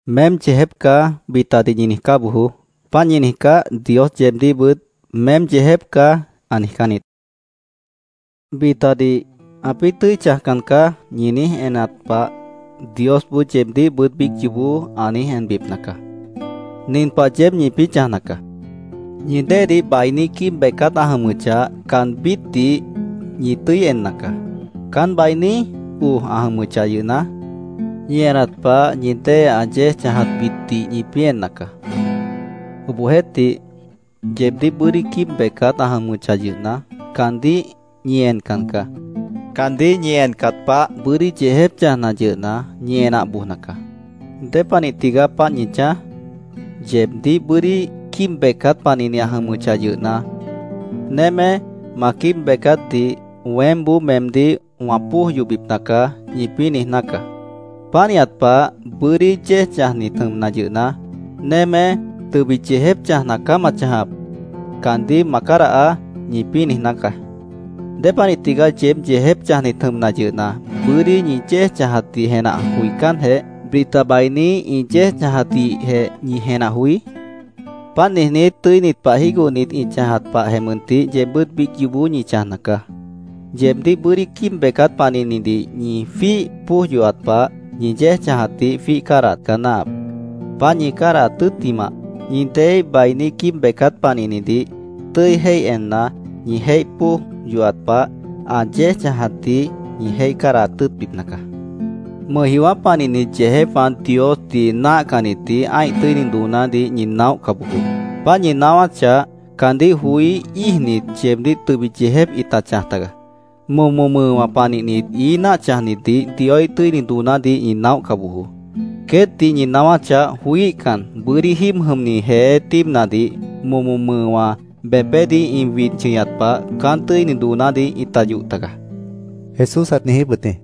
“ ‘Meém yeejép caá’, bitadih ñi niijcá bojoó. Páant ñi niijcáh, Dios yeebdíhbʉt ‘Meém yeejép caá’, ã niijcán niít. Bitadih ‘Ãpĩ́ tʉ́i chãjcan caá’, ñi niíj enat pah, Diosboó yeebdíhbʉt biíc yoobó ã niíj enbipna caá. Nin pah yeéb ñipĩ́ chãjna caá: Ñi déedih bainí quíib becát ã jʉmʉchah, caanbítdih ñi tʉ́i enna caá. Caán bainí oj ã jʉmʉchah yʉhna, ñi enat pah, ñi dée ã yéej chãjatbitdih ñipĩ́ enna caá. Obohjeéhtih, yeebdíh bʉ́dí quíib becát ã jʉmʉchah yʉhna, caandíh ñi encan caá. Caandíh ñi encat pah, bʉ́dí yeejép chãjna yʉhna, ñi enah bojna caá. ¿Dépanih tigaá páant ñi chãj? Yeebdíh bʉ́dí quíib becát panihni ã jʉmʉchah yʉhna, ‘Némé, ma quíib becátdih weémboó meemdíh wã póoj yohbipna caá’, ñipĩ́ niijná caá. Pánihat pah, bʉ́dí yéej chãjnit jʉmna yʉhna, ‘Némé, tʉbit yeejép chãjna caá ma chãjap. Caandíh ma cádahaá’, ñipĩ́ niijná caá. ¿Dépanih tigaá yeéb yeejép chãjnit jʉmna yʉhna, bʉ́dí ñi yéej chãjatdih jenah joicánjeh, bita bainí ĩ yéej chãjatdihjeh ñi jenah joí? Páant niijnít, tʉ́init pah jígohnit ĩ chãjat pahjeh mʉntih yeebbʉ́t biíc yoobó ñi chãjna caá. Yeebdíh bʉ́dí quíib becát panihnidih ñi jwíih póoj yohat pah, ñi yéej chãjatdih jwíih cádahat caá náahap. Páant ñi cádahat tʉ́ttimah, ñi déeíh bainí quíib becát panihnidih tʉ́i jéih enna, ñi jéih póoj yohat pah, ã yéej chãjatdih ñi jéih cádahat tʉ́ʉtbipna caá. “Mʉjjiowã́ panihnit yeejépwã Diosdih náahcannitdih ã́ih tʉ́ini doonádih ñi naóhca bojoó. Páant ñi naáwáchah, caandíh joí íijnit, yeebdíh tʉbit yeejép ĩta chãj taga. Momo mʉʉwã panihnit, ií náah chãjnitdih Dioíh tʉ́ini doonádih ñi naóhca bojoó. Queétdih ñi naáwáchah, joííhcan, bʉ́dí jíib jʉmni jeé tíibnadih momo mʉʉwã bepédih ĩ wid chʉñat pah, caán tʉ́ini doonádih ĩta yoh tagaá”, Jesús ãt niijíp wʉt jĩ.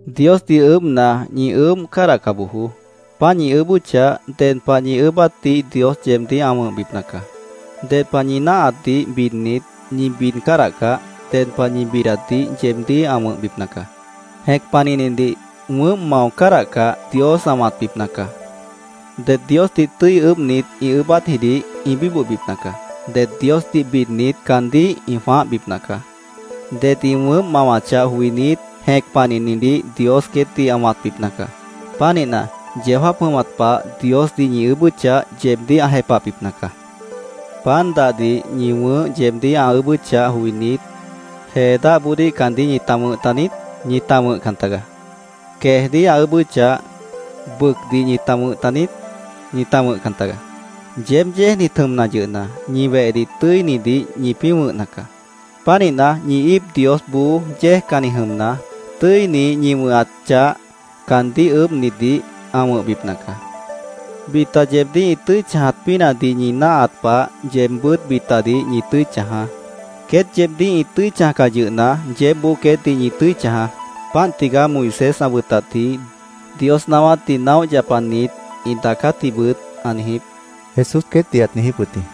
“Diosdih ʉʉ́bhna, ñi ʉʉ́bh cádahca bojoó. Páant ñi ʉʉ́bʉ́chah, ded pah ñi ʉʉ́bátdih Dios yeebdíh ã wʉ̃hbipna caá. Ded pah ñi náahatdih bidnit, ñi bid cádahcah, ded pah ñi bidatdih yeebdíh ã wʉ̃hbipna caá. Jẽc panihnidih wʉʉ́mp mao cádahcah, Dios ã wãtbipna caá. Det Diosdih tʉ́i ʉʉ́bhnit, ĩ ʉʉ́bátjidih ĩ bíbohbipna caá. Det Diosdih bidnit, caandíh ĩ jwãáhbipna caá. Det ĩ wʉʉ́mp mawachah joinít, jẽc panihnidih Dios queétdih ã wãtbipna caá. Pánihna, yeó jáap jʉmat pah Diosdih ñi ʉʉ́bʉ́chah, yeebdíh ã jepahbipna caá. “¿Pan dahdih ñi wʉ̃ʉ́h yeebdíh ã ʉʉ́bʉ́chah joinít, jee dáhboodíh caandíh ñita wʉ̃h taniít? Ñita wʉ̃hcan tagaá. ¿Queejdíh ã ʉʉ́bʉ́chah, bʉcdih ñita wʉ̃h taniít? Ñita wʉ̃hcan tagaá. Yeéb yéejnit jʉmna yʉhna, ñi wehdih tʉ́inidih ñipĩ́ wʉ̃hna caá. Pánihna, ñi íip Diosboó yéejcanni jʉmna, tʉ́ini ñi wʉ̃hat chah caandíh ʉʉ́bhnitdih ã wʉ̃hbipna caá. “Bita yeebdíh ĩ tʉ́i chãjat pínahdih ñi náahat pah, yeebbʉ́t bitadih ñi tʉ́i chãjaá. Queét yeebdíh ĩ tʉ́i chãjcah yʉhna, yeébboó queétdih ñi tʉ́i chãjaá. Páant tigaá Moisés ã wʉtatji, Dios naáwátdih naóh yapanit ĩ daacátjibʉt ã niijíp”, Jesús queétdih ãt niijíp wʉt jĩ.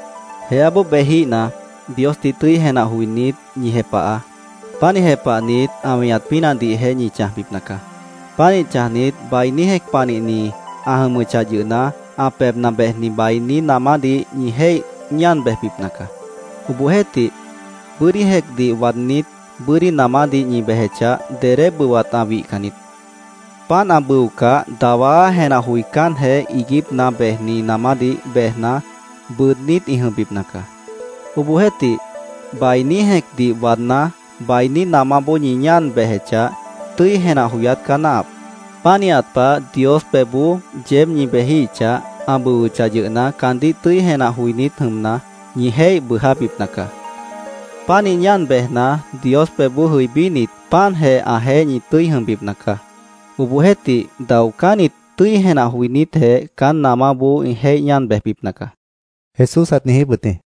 “Jeáboó bejíhna, Diosdih tʉ́i jenah joinít, ñi jepahaá. Pánih jepahnit, ã weñat pínahdihjeh ñi chãjbipna caá. Pánih chãjnit, bainí jẽc panihni ã jʉmʉchah yʉhna, ã pebhna bejni bainí namádih ñi jéih ñáan bejbipna caá. Obohjeéhtih bʉ́dí jẽcdih waadnít, bʉ́dí namádih ñi bejechah, dedé bʉwat ã wihcan niít. Páant ã bʉocah, dawá jenah joicánjeh iiguípna bejni namádih bejna, bʉʉdnít ĩ jʉmbipna caá. Obohjeéhtih, bainí jẽcdih waadná, bainí namáboó ñi ñáan bejechah, tʉ́i jenah joyát caá náahap. Pánihat pah, Dios pebhboó yeéb ñi bejíhichah, ã bʉwʉchah yʉhna, caandíh tʉ́i jenah joinít jʉmna, ñi jéih bʉʉjábipna caá. Pánih ñáan bejna, Dios pebhboó jʉibínit, páantjeh ãjeéh ñi tʉ́i jʉmbipna caá. Obohjeéhtih, daocánnit tʉ́i jenah joinítjeh caán namáboó ĩ jéih ñáan bejbipna caá”, Jesús ãt niijíp wʉt jĩ.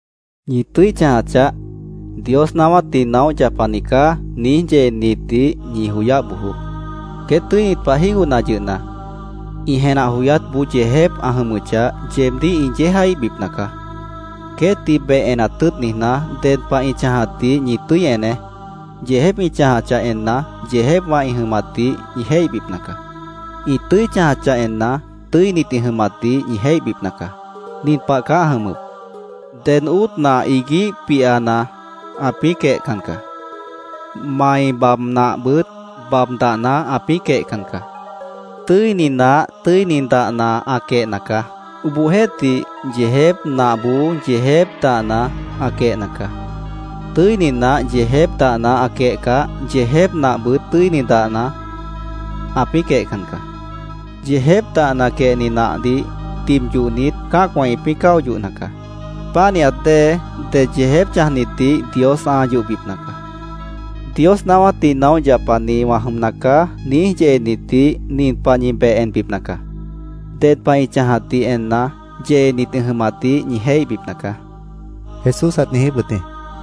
“Ñi tʉ́i chãja chaáh. ‘Dios naáwátdih naóh yapani caá’, niíj yeenitdih ñi joyáh bojoó. Queét tʉ́init pah jígohna yʉhna, ĩ jenah joyátboó yeejép ã jʉmʉchah, yeebdíh ĩ yéejaíhbipna caá. Queétdih beh enat tʉ́ʉt niijná, ded pah ĩ chãjatdih ñi tʉ́i eneé. Yeejép ĩ chãjachah enna, yeejépwã ĩ jʉmatdih ñi jéihbipna caá. Ĩ tʉ́i chãjachah enna, tʉ́init ĩ jʉmatdih ñi jéihbipna caá. Nin pah caá ã jʉmʉp: Ded óot nah iguíh pihana ãpĩ́ quehcan caá. Mai bab nahbʉt bab dahna ãpĩ́ quehcan caá. Tʉ́ini nah tʉ́ini dahna ã quehna caá. Obohjeéhtih, yeejép nahboó yeejép dahna ã quehna caá. Tʉ́ini nah yeejép dahna ã quehcah, yeejép nahbʉt tʉ́ini dahna ãpĩ́ quehcan caá. Yeejép dahna quehni nahdih tib yohnit, cã́acwã ĩpĩ́ cáo yohna caá. Pánihat dée det yeejép chãjnitdih Dios ã yohbipna caá. ‘Dios naáwátdih naóh yapani wã jʉmna caá’, niíj yeenitdih nin pah ñi beh enbipna caá: Ded pah ĩ chãjatdih enna, yeenit ĩ jʉmatdih ñi jéihbipna caá”, Jesús ãt niijíp wʉt jĩ.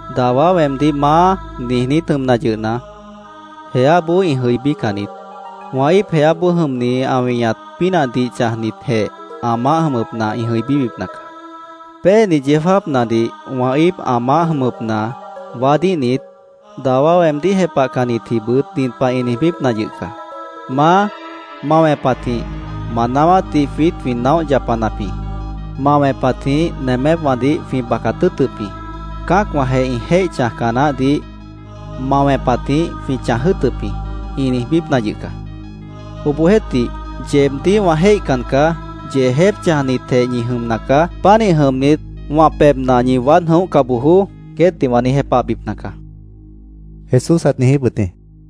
“Dawá weemdíh ‘Maá’, niijnít jʉmna yʉhna, jeáboó ĩ jʉibícan niít. Wã íip jeáboó jʉmni ã weñat pínahdih chãjnitjeh ã maáh jʉmʉpna ĩ jʉibíbipna caá. Péeni yeó jáapnadih wã íip ã maáh jʉmʉpna waádíhnit, dawá weemdíh jepahcannitjibʉt nin pah ĩ niijbípna yʉh caá: ‘Maá, ma wẽpatjĩh ma naáwátdih jwiít jwĩ naóh yapanap jĩ. Ma wẽpatjĩh nemépwãdih jwĩ bacat tʉ́ʉtʉp jĩ. Cã́acwãjeh ĩ jéih chãjca naáhdih ma wẽpatjĩh jwĩ chãj jʉ́ʉtʉp jĩ’, ĩ niijbípna yʉh caá. Obohjeéhtih, ‘¡Yeebdíh wã jéihcan caá! ¡Yeejép chãjnitjeh ñi jʉmna caá! Pánih jʉmnit, wã pebhna ñi waád jʉ̃óhca bojoó’, queétdih wã niíj jepahbipna caá”, Jesús ãt niijíp wʉt jĩ.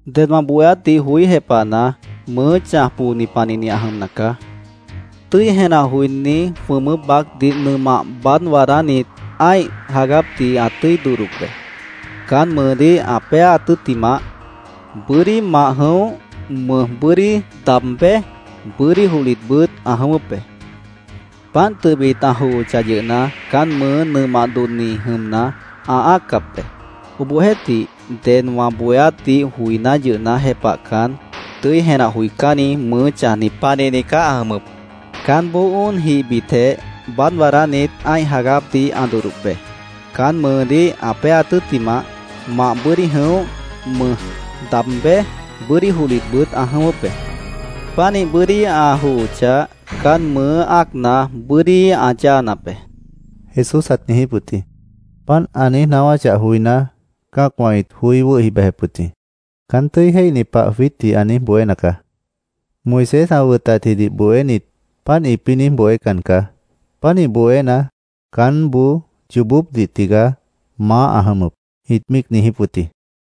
“Ded wã bohéátdih joí jepahna, mʉʉ́ chãj pooni panihni ã jʉmna caá. Tʉ́i jenah joiní jwʉmʉ́p baácdih nʉmah baád waadánit, ã́ih jagápdih ã tʉ́i dodhdop be. Caán mʉʉdíh ã péaat tʉ́ttimah, bʉ́dí mah jʉ̃óh, mʉj bʉ́dí daab béj, bʉ́dí johlitbʉt ã jʉ̃ʉ́wʉ́p be. Páant tʉbit ã johochah yʉhna, caán mʉʉ́ nʉmah dodhni jʉmna, ã ã́accap be. Obohjeéhtih, ded wã bohéátdih joiná yʉhna, jepahcan, tʉ́i jenah joicánni mʉʉ́ chãjni panihni caá ã jʉmʉp. Caánboó óonjihbitjeh baád waadánit, ã́ih jagápdih ã dodhdop be. Caán mʉʉdíh ã péaat tʉ́ttimah, mah bʉ́dí jʉ̃óh, mʉj daab béj, bʉ́dí johlitbʉt ã jʉ̃ʉ́wʉ́p be. Pánih bʉ́dí ã johochah, caán mʉʉ́ ã́acna, bʉ́dí ã yáanap be”, Jesús ãt niijíp wʉt jĩ. Páant ã niíj naáwáchah joiná, cã́acwã ĩt joí wʉ́hi bejep wʉt jĩ. “Caán tʉ́i jéihni pah jwiítdih ã niíj bohéna caá. Moisés ã wʉtatjidih bohénit páant ĩpĩ́ niíj bohécan caá. Pánih bohéna, caánboó yoobópdih tigaá maáh ã jʉmʉp”, ĩt míic niijíp wʉt jĩ.